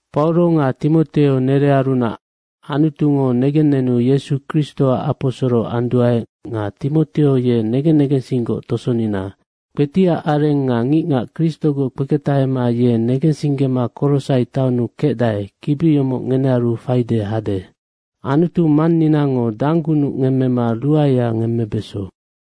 Pauro nga Timoteo nerearunac. Anutungo negennenu Yesu Kristoac aposoro anduae nga Timoteo ye negen negensinggoc tosonina. Kpetiac areng nga ngicngac Kristogoc kpeketahema ye negensinggema Korosai taonnu kecdae, kibi yomoc ngenearu faide hade. Anutu Manninango danggunuc ngemmema ruaea ngemmebeso.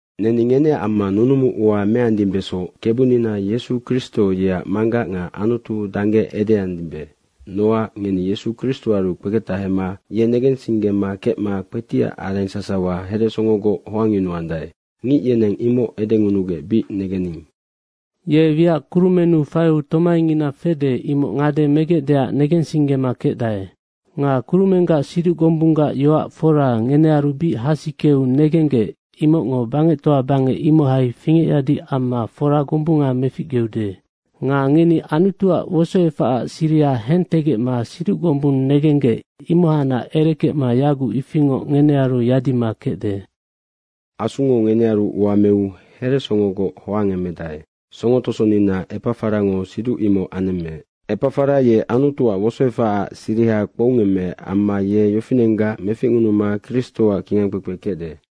Neni ngeneac amma nunumu ua meandimbesoc, Kebunina Yesu Kristo yeac Manggac nga Anutu dangge edeandimbe. Nocac ngeni Yesu Kristoaru kpeketahema ye negensinggema kecma kpetiac areng sasawa heresongogoc hoangyunuandae, ngic yeneng imoc edenunugec bic negening. Ye wiac kurumennu faiu tomaingina fede imoc ngade megecdeac negensinggema kecdae. Nga kurumenggac siduc gombunggac yoac fora ngenearu bic hasikeu negenggec, imocngo bangectoa bangec imohai fingecyadi amma fora gombunga meficgeude. Nga ngeni Anutuac wosoefacac siriha hentegecma siduc gombung negenggec, imohacnac erekecma yaguc ifingoc ngenearu yadima kecde. Asungo ngenearu ua meu heresongogoc hoangemedae, songo tosonina Epafarango siduc imoc anemmeec. Epafara ye Anutuac wosoefacac siriha kpoungemmeec amma ye yofinenggac meficngunuma Kristoac kingangkpekpe kecde.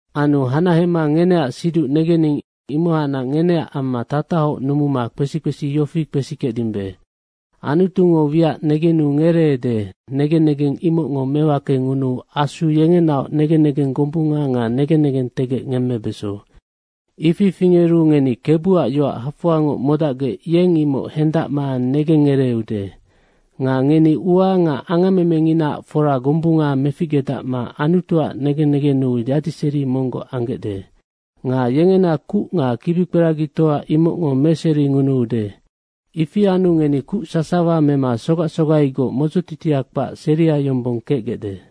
Anu hanahema ngeneac siduc negening, imohacnac ngeneac amma tatahoc numuma kpesi kpesi yofi kpesikecdimbe, Anutungo wiac negenu ngereede, negen negeng imocngo mewakengunuu Asu yengenaoc negen negeng gombunga nga negen negentegec ngemmebeso. Ifi fingeru ngeni Kebuac yoac hafoangoc modacgec yeng imoc hendacma negengngereeude. Nga ngeni ua nga angammemenginaac fora gombunga meficgedacma Anutuac negen negennu yadiseri monggoc anggecde. Nga yengena kuc nga kibikperagitoa imocngo meseringunuude. Ifi anu ngeni kuc sasawa mema sogac sogaigoc modzotitia kpac seria yombong kecgecde.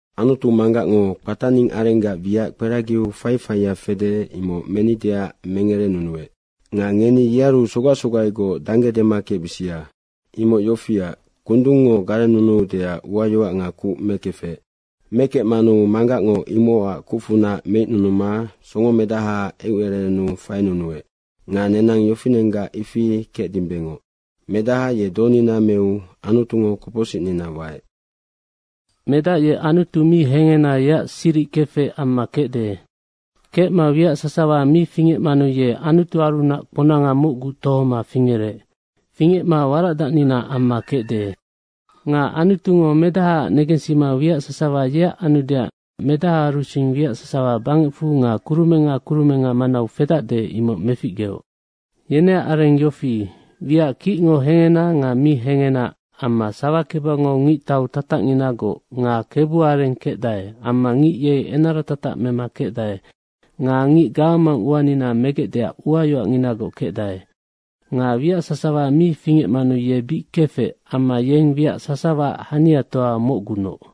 Anutu Manggacngo kpataning arenggac wiac kperagiu faifaia fede, imoc menideac mengerenunuec. Nga ngeni yearu sogac sogaigoc dangge dema kecbisia. Imoc yofiac, kundungngo garennunuudeac uayoac nga kuc mekefec. Mekecmanu Manggacngo imocac kucfunac meicnunuma Songomedahaac eucererennu fainunuec nga nenang yofinenggac ifi kecdimbengoc. Medaha ye donina meu Anutungo kopocsicnina waec. Medac ye Anutu mi hengena yeac siric kefec amma kecde. Kecma wiac sasawa mi fingecmanu ye Anutuarunac kponanga mocgu tohoma fingerec. Fingecma waracdacnina amma kecde. Nga Anutungo Medahaac negensima wiac sasawa yeac anudeac Medahaarusing wiac sasawa bangecfu nga kurumenga kurumenga manau fedacde, imoc meficgeoc. Yeneac areng yofi, wiac kicngo hengena nga mi hengena amma sawakebangau ngictau tatacnginagoc nga kebuareng kecdae amma ngic yei enara tatac mema kecdae nga ngic gawamang uanina megecdeac uayoacnginagoc kecdae. Nga wiac sasawa mi fingecmanu ye bic kefec amma yeng wiac sasawaac haniatoa mocgunoc.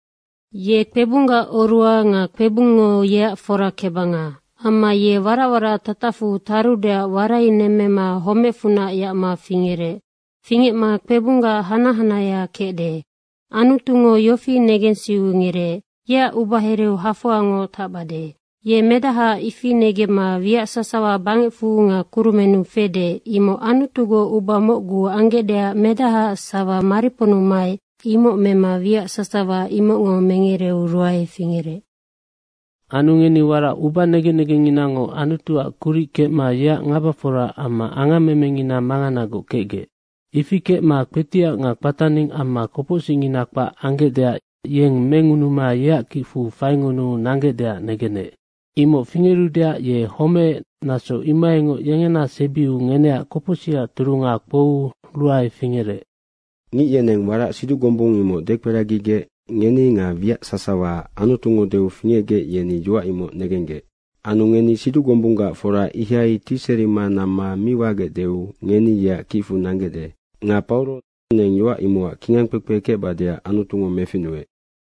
Ye kpebunggac oruha nga kpebungngo yeac forakebanga. Amma ye warac warac tatacfu tarudeac warainemmema homecfunac yacma fingerec. Fingecma kpebunggac hanac hanahea kecde. Anutungo yofi negensiu ngereec, “Yeac ubahereau hafoangoc tacbade.” Ye medahaac ifi negemma wiac sasawa bangecfu nga kurumennu fede, imoc Anutugoc uba mocgu anggecdeac medahaac sawa mariponnu maec, imoc mema wiac sasawa imocngo mengereu ruae fingerec. Anu ngeni warac ubanegen negengnginango Anutuac kuric kecma yeac ngabafora amma angammemengina manganagoc kecgec. Ifi kecma kpetiac nga kpataning amma kopocsicngina kpac anggecdeac yeng mengunuma yeac kicfu faingunuu nanggecdeac negenec. Imoc fingerudeac ye homeec, naso imohaingoc yengena sebiu ngeneac kopocsicac turunga kpouu ruae fingerec. Ngic yeneng warac siduc gombung imoc dekperagigec ngeni nga wiac sasawa Anutungo deu fingecgec, yeni yoac imoc negenggec. Anu ngeni siduc gombunggac fora ihai tiserima namma mi wagecdeu ngeni yeac kicfu nanggecde. Nga Pauro neng yoac imocac kingangkpekpe kecbadeac Anutungo meficnuec.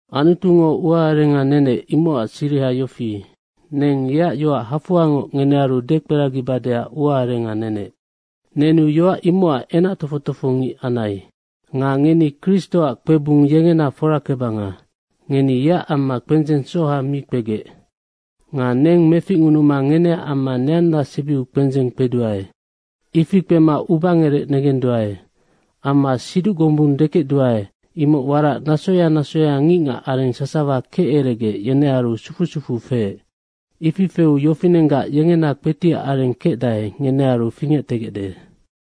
Anutungo ua arenga nenec imocac siriha yofi, neng yeac yoac hafoangoc ngenearu dekperagibadeac ua arenga nenec. Nenu yoac imocac kingangkpekpe anai. Nga ngeni Kristoac kpebung yengena forakebanga. Ngeni yeac amma kpendzeng soha mi kpegec. Nga neng meficngunuma ngeneac amma neanna sebiu kpendzeng kpeduae. Ifi kpema ubangerec negenduae. Amma siduc gombung dekecduae, imoc warac nasoya nasoya ngicngac areng sasawa keceregec yenearu sufu sufu feec. Ifi feu yofinenggac yengena kpetiac areng kecdae, ngenearu fingectegecde.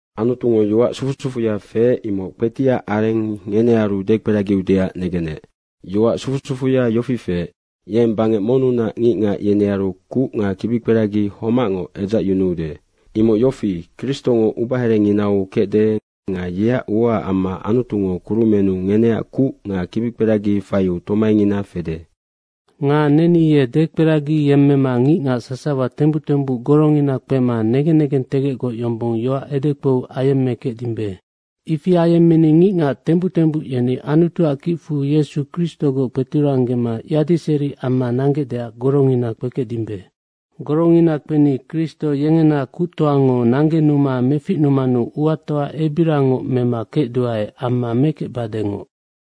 Anutungo yoac sufu sufuya feec, imoc kpetiac areng ngenearu dekperagiudeac negenec. Yoac sufu sufuya yofi feec, yeng bangec monnunac ngicngac, yenearu kuc nga kibikperagi homacngoc edzacyunuude. Imoc yofi, Kristongo ubaherenginau kecde nga yeac uaac amma Anutungo kurumennu ngeneac kuc nga kibikperagi faiu tomaingina fede. Nga neni ye dekperagiyemmema ngicngac sasawa tembuc tembuc gorongina kpema negen negentegecgoc yombong yoac edekpou ayemmekecdimbe. Ifi ayemmeni ngicngac tembuc tembuc yeni Anutuac kicfu Yesu Kristogoc kpeturanggema yadiseri amma nanggecdeac gorongina kpekecdimbe. Gorongina kpeni Kristo yengena kuctoango nanggenuma meficnumanu uatoa ebiriangoc mema kecduae amma mekecbadengoc.